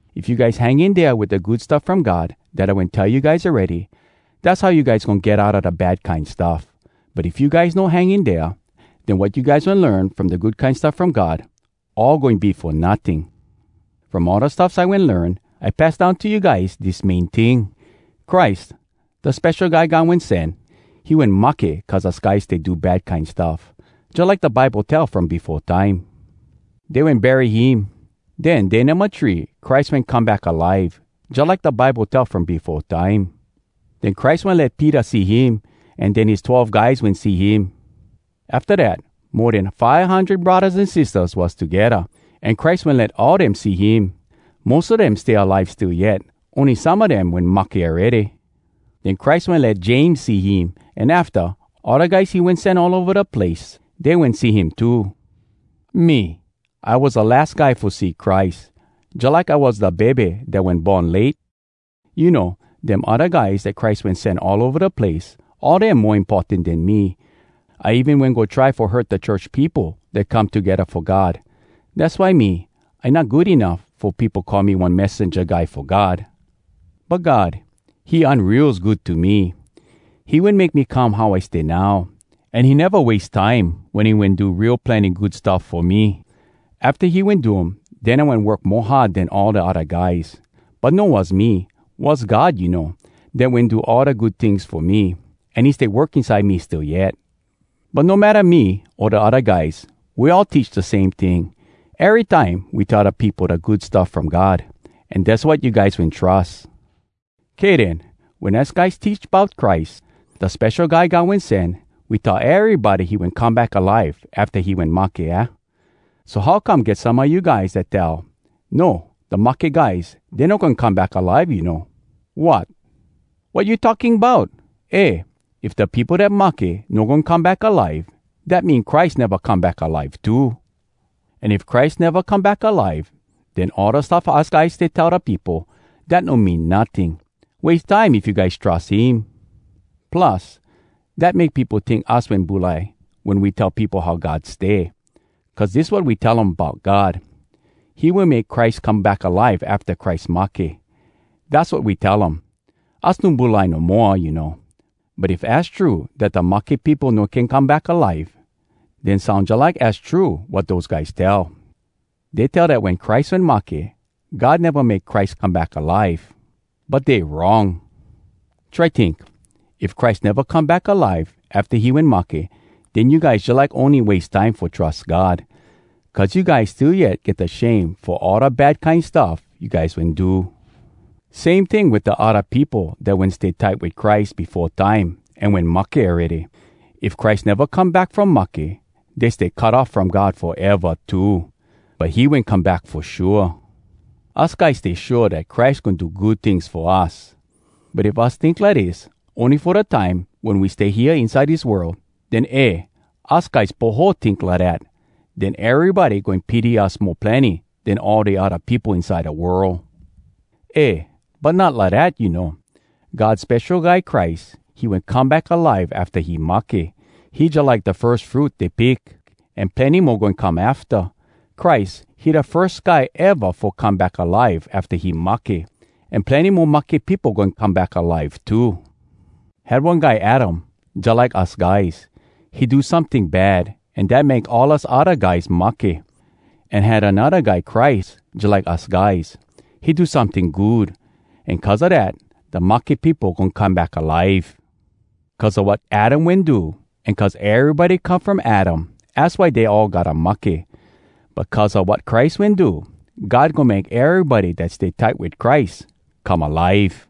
If you guys hang in dea wit da Good Stuff From God dat I wen tell you guys awready, dass how you guys goin get outa da bad kine stuff. But if you guys no hang in dea, den wat you guys wen learn from da Good Kine Stuff From God, all goin be fo notting! From all da stuffs I wen learn, I pass down to you guys dis main ting: Christ, da Spesho Guy God Wen Sen, he wen mahke cuz us guys stay do bad kine stuff, jalike da Bible tell from befo time. Dey wen bury him. Den, day numba three, Christ wen come back alive, jalike da Bible tell from befo time. Den Christ wen let Peter see him, an den his Twelve Guys wen see him. Afta dat, mo den five hundred braddahs an sistahs was togedda, an Christ wen let all dem see him. Mos a dem stay alive still yet, ony some a dem wen mahke awready. Den Christ wen let James see him, an afta, all da guys he wen sen all ova da place, dey wen see him too. Me, I was da las guy fo see Christ. Jalike I was da bebe dat wen born late. You know, dem odda guys dat Christ wen sen all ova da place, all dem mo importan den me. I even wen go try fo hurt da church peopo dat come togedda fo God. Dass why me, I not good enuff fo peopo call me one messenja guy fo God. But God, he unreals good to me! He wen make me come how I stay now. An he neva wase time wen he wen do real plenny good stuff fo me. Afta he wen do um, den I wen work mo hard den all da odda guys. But no was me—was God, you know, dat wen do all da good tings fo me, an he stay work inside me still yet. But no matta me o da odda guys, we all teach da same ting. Erytime we tell da peopo da Good Stuff From God. An dass wat you guys wen trus. Kay den. Wen us guys teach bout Christ, da Spesho Guy God Wen Sen, we tell erybody he wen come back alive afta he wen mahke, aah? So how come, get some a you guys dat tell, “No, da mahke guys, dey no goin come back alive, you know.” Wot! Wat you talking bout?! Eh! If da peopo dat mahke no goin come back alive, dat mean Christ neva come back alive too! An if Christ neva come back alive, den all da stuff us guys stay tell da peopo, dat no mean notting. Wase time if you guys trus him. Plus, dat make peopo tink us wen bulai wen we tell peopo how God stay. Cuz dis wat we tell um bout God: “He wen make Christ come back alive afta Christ mahke!” Dass wat we tell um. Us no bulai no moa, you know. But if az true, dat da mahke peopo no can come back alive, den soun jalike az true wat dose guys tell. Dey tell dat wen Christ wen mahke, God neva make Christ come back alive. But dey wrong! Try tink: if Christ neva come back alive afta he wen mahke, den you guys jalike ony wase time fo trus God. Cuz you guys still yet get da shame fo all da bad kine stuff you guys wen do! Same ting wit da odda peopo dat wen stay tight wit Christ befo time an wen mahke awready—if Christ neva come back from mahke, dey stay cut off from God foeva too! But he wen come back fo shua! Us guys stay shua dat Christ goin do good tings fo us. But if us tink lidis ony fo da time wen we stay hea inside dis world, den eh! us guys poho tink lidat! Den erybody goin pity us mo plenny den all da odda peopo inside da world! Eh! But not lidat, you know! God Spesho Guy Christ, he wen come back alive afta he mahke! He jalike da firs fruit dey pick, an plenny mo goin come afta. Christ, he da firs guy eva fo come back alive afta he mahke! An plenny mo mahke peopo goin come back alive too. Had one guy Adam jalike us guys. He do someting bad an dat make all us odda guys mahke. An had anodda guy Christ jalike us guys. He do someting good, an cuz a dat, da mahke peopo goin come back alive! Cuz a wat Adam wen do, an cuz erybody come from Adam, az why dey all gotta mahke. But cuz a wat Christ wen do, God goin make erybody dat stay tight wit Christ come alive!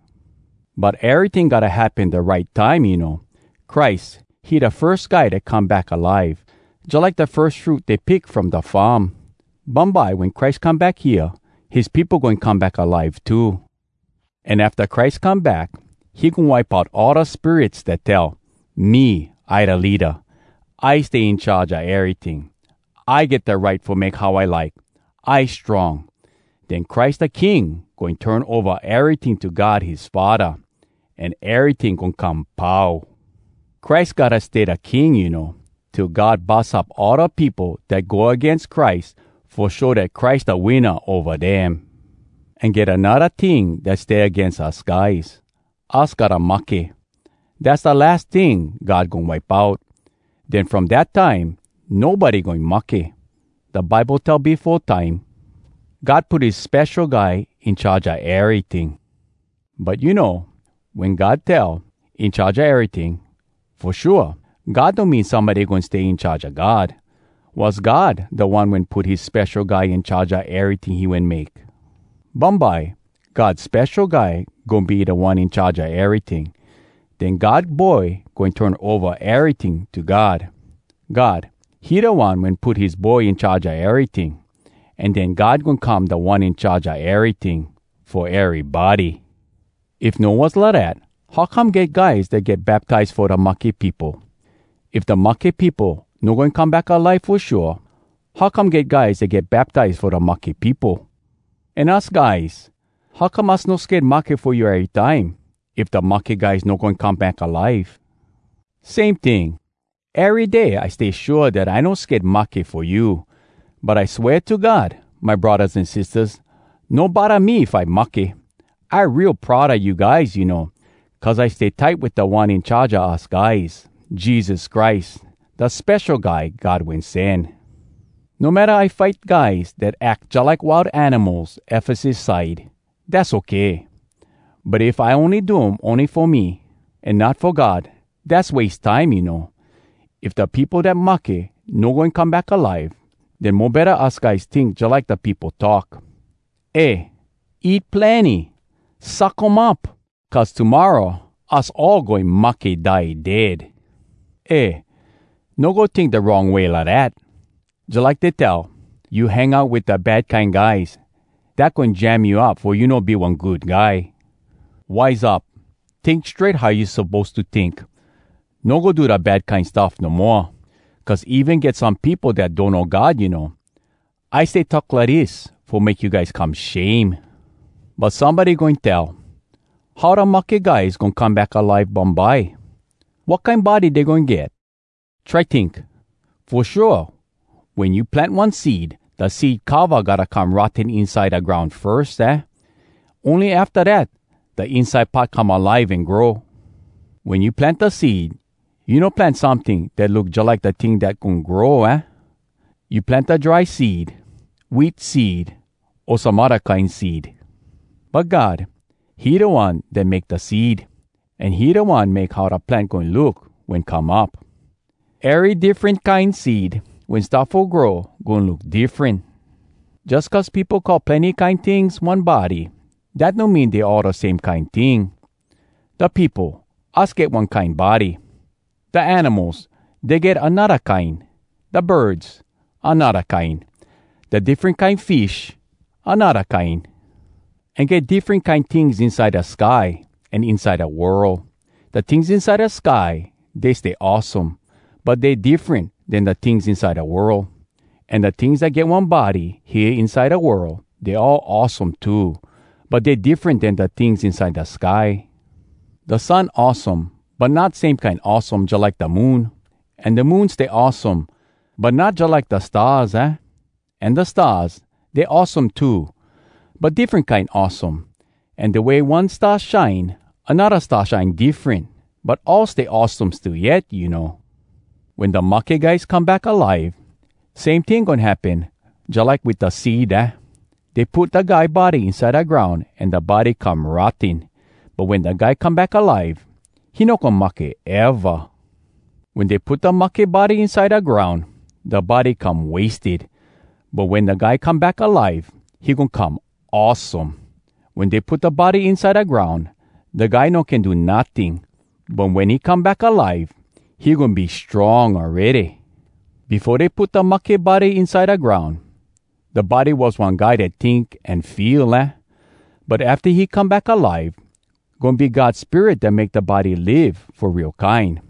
But eryting gotta happen da right time, you know. Christ, he da firs guy dat come back alive, jalike da firs fruit dey pick from da farm. Bumbye, wen Christ come back hea, his peopo goin come back alive too. An afta Christ come back, he goin wipe out all da spirits dat tell, “Me, I da leada! I stay in charge a eryting! I get da right fo make how I like! I strong!” Den Christ da King goin turn ova eryting to God his faddah, an eryting goin come pau. Christ gotta stay da King, you know, till God bus up all da peopo dat go agains Christ fo show dat Christ da winna ova dem. An get anodda ting dat stay agains us guys—us gotta mahke. Dass da las ting God goin wipe out. Den from dat time, nobody goin mahke. Da Bible tell befo time, “God put his Spesho Guy in charge a eryting.” But you know, wen God tell “in charge a eryting”—fo shua, God no mean somebody goin stay in charge a God. Was God, da One wen put his Spesho Guy in charge a eryting he wen make. Bumbye, God Spesho guy goin be Da One In Charge a eryting. Den God Boy goin turn ova eryting to God. God, he da One wen put his Boy in charge a eryting. An den God goin come Da One In Charge a eryting, fo erybody! If no was lidat, how come get guys dat get baptize fo da mahke peopo? If da mahke peopo no goin come back alive fo shua, how come get guys dat get baptize fo da mahke peopo? An us guys, how come us no sked mahke fo you erytime, if da mahke guys no goin come back alive? Same ting, ery day I stay shua dat I no sked mahke fo you! But I swea to God, my braddahs an sistahs, no bodda me if I mahke. I real proud a you guys, you know, cuz I stay tight wit Da One In Charge a us guys, Jesus Christ, da Spesho Guy God Wen Sen. No matta I fight guys dat ack jalike wild animals Efesus side, dass okay! But if I ony do um ony fo me, an not fo God, dass wase time, you know. If da peopo dat mahke no goin come back alive, den mo betta us guys tink jalike da peopo talk, “Eh! Eat plenny! Suck um up! Cuz tomorra us all goin mahke die dead!” Eh! No go tink da wrong way lidat! Jalike dey tell, “You hang out wit da bad kine guys, dat goin jam you up fo you no be one good guy!” Wise up! Tink strait how you suppose to tink! No go do da bad kine stuff no moa! Cuz even get some peopo dat donno God, you know. I stay talk lidis fo make you guys come shame. But somebody goin tell, “How da mahke guys goin come back alive bumbye? Wat kine body dey goin get?” Try tink! Fo shua, wen you plant one seed, da seed cova gotta come rotten inside da groun firs, aah? Ony afta dat, da inside part come alive an grow. Wen you plant da seed, you no plant someting dat look jalike da ting dat goin grow, aah? You plant da dry seed, wheat seed o some odda kine seed. But God, he da One dat make da seed, an he da One make how da plant goin look wen come up. Ery diffren kine seed, wen start fo grow goin look diffren. Jus cuz peopo call plenny kine tings “one body,” dat no mean dey all da same kine ting. Da peopo, us get one kine body. Da animals, dey get anodda kine. Da birds, anodda kine. Da diffren kine fish, anodda kine. An get diffren kine tings inside da sky an inside da world. Da tings inside da sky, dey stay awesome, but dey diffren den da tings inside da world. An da tings dat get one body hea inside da world, dey all awesome too, but dey diffren den da tings inside da sky. Da sun awesome, but not same kine awesome jalike da moon. An da moon stay awesome, but not jalike da stars, aah? An da stars, dey awesome too, but diffren kine awesome. An da way one star shine, anodda star shine diffren, but all stay awesome still yet, you know. Wen da mahke guys come back alive, same ting goin happen jalike wit da seed, aah? Dey put da guy body inside da groun an da body come rotten. But wen da guy come back alive, he no goin mahke eva! Wen dey put da mahke body inside da groun, da body come wasted. But wen da guy come back alive, he goin come awesome! Wen dey put da body inside da groun, da guy no can do notting. But wen he come back alive, he goin be strong awready! Befo dey put da mahke body inside da groun, da body was one guy dat tink an feel, aah? But afta he come back alive, goin be God Spirit dat make da body live fo real kine!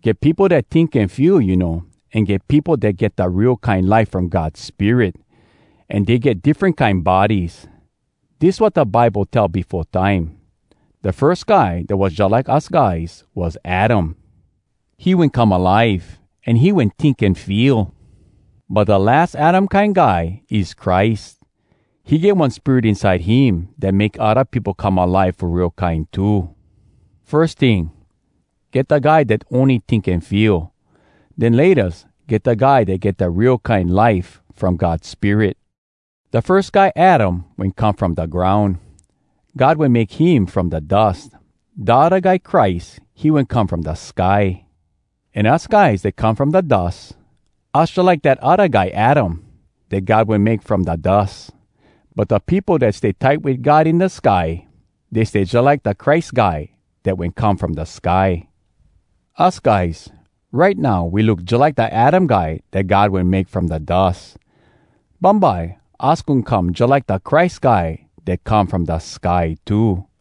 Get peopo dat tink an feel, you know, an get peopo dat get da real kine life from God Spirit. An dey get diffren kine bodies. Dis wat da Bible tell befo time: Da firs guy dat was jalike us guys was Adam. He “wen come alive an he wen tink an feel.” But da las Adam kine guy is Christ. He get one spirit inside him dat make odda peopo come alive fo real kine too. Firs ting, get da guy dat ony tink an feel. Den laytas, get da guy dat get da real kine life from God Spirit. Da firs guy Adam wen come from da groun. God wen make him from da dus. Da odda guy Christ, he wen come from da sky. An us guys dat come from da dus, us jalike dat odda guy Adam dat God wen make from da dus. But da peopo dat stay tight wit God in da sky, dey stay jalike da Christ Guy dat wen come from da sky. Us guys, right now we look jalike da Adam guy dat God wen make from da dus. Bumbye, us goin come jalike da Christ Guy dat come from da sky, too.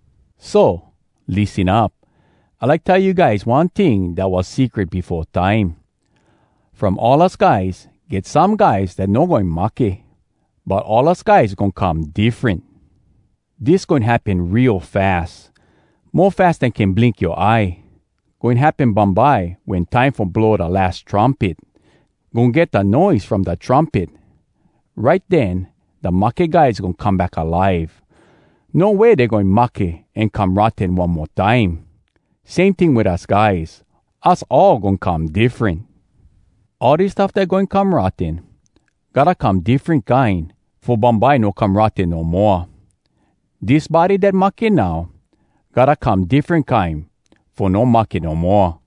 So, lissen up! I like tell you guys one ting dat was secret befo time! From all us guys, get some guys dat no goin mahke! But all us guys goin come diffren! Dis goin happen real fas, mo fas den can blink yoa eye. Goin happen bumbye wen time fo blow da las trumpet. Goin get da noise from da trumpet. Right den, da mahke guys goin come back alive. No way dey goin mahke an come rotten one mo time! Same ting wit us guys, us all goin come diffren. All dis stuff dat goin come rotten, gotta come diffren kine, fo bumbye no come rotten no moa. Dis body dat mahke now, gotta come diffren kine fo no mahke no moa!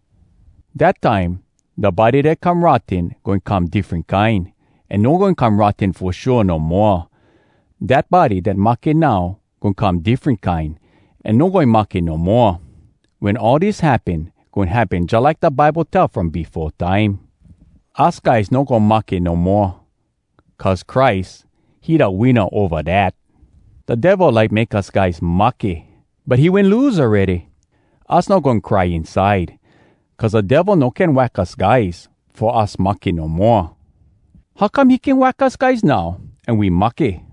Dat time, da body dat come rotten goin come diffren kine, an no goin come rotten fo shua no moa! Dat body dat mahke now goin come diffren kine, an no goin mahke no moa! Wen all dis happen, goin happen jalike da Bible tell from befo time: “Us guys no goin mahke no moa, Cuz Christ, he da winna ova dat!” “Da Devil like make us guys mahke, But he wen lose awready! Us no goin cry inside, Cuz da Devil no can wack us guys fo us mahke no moa!” How come he can wack us guys now an we mahke?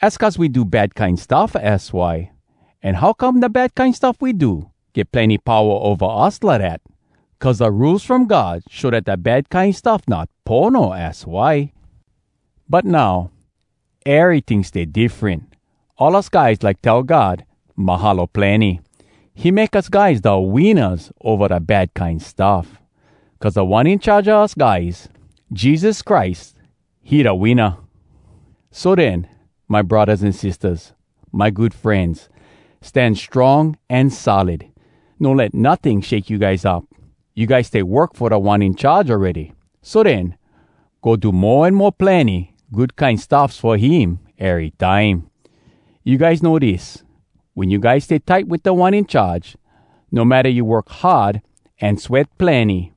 Az cuz we do bad kine stuff, az why. An how come da bad kine stuff we do, get plenny powa ova us lidat? Cuz da Rules From God show dat da bad kine stuff not pono, az why. But now, eryting stay diffren! All us guys like tell God, “Mahalo plenny!” He make us guys da winnas ova da bad kine stuff. Cuz Da One In Charge a us guys, Jesus Christ, he da winna! So den, my braddahs an sistahs, my good frenz, stan strong an solid. No let notting shake you guys up. You guys stay work fo Da One In Charge awready, so den, go do mo an mo plenny good kine stuffs fo him erytime. You guys know dis: Wen you guys stay tight wit Da One In Charge, no matta you work hard an sweat plenny,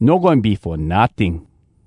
no goin be fo notting!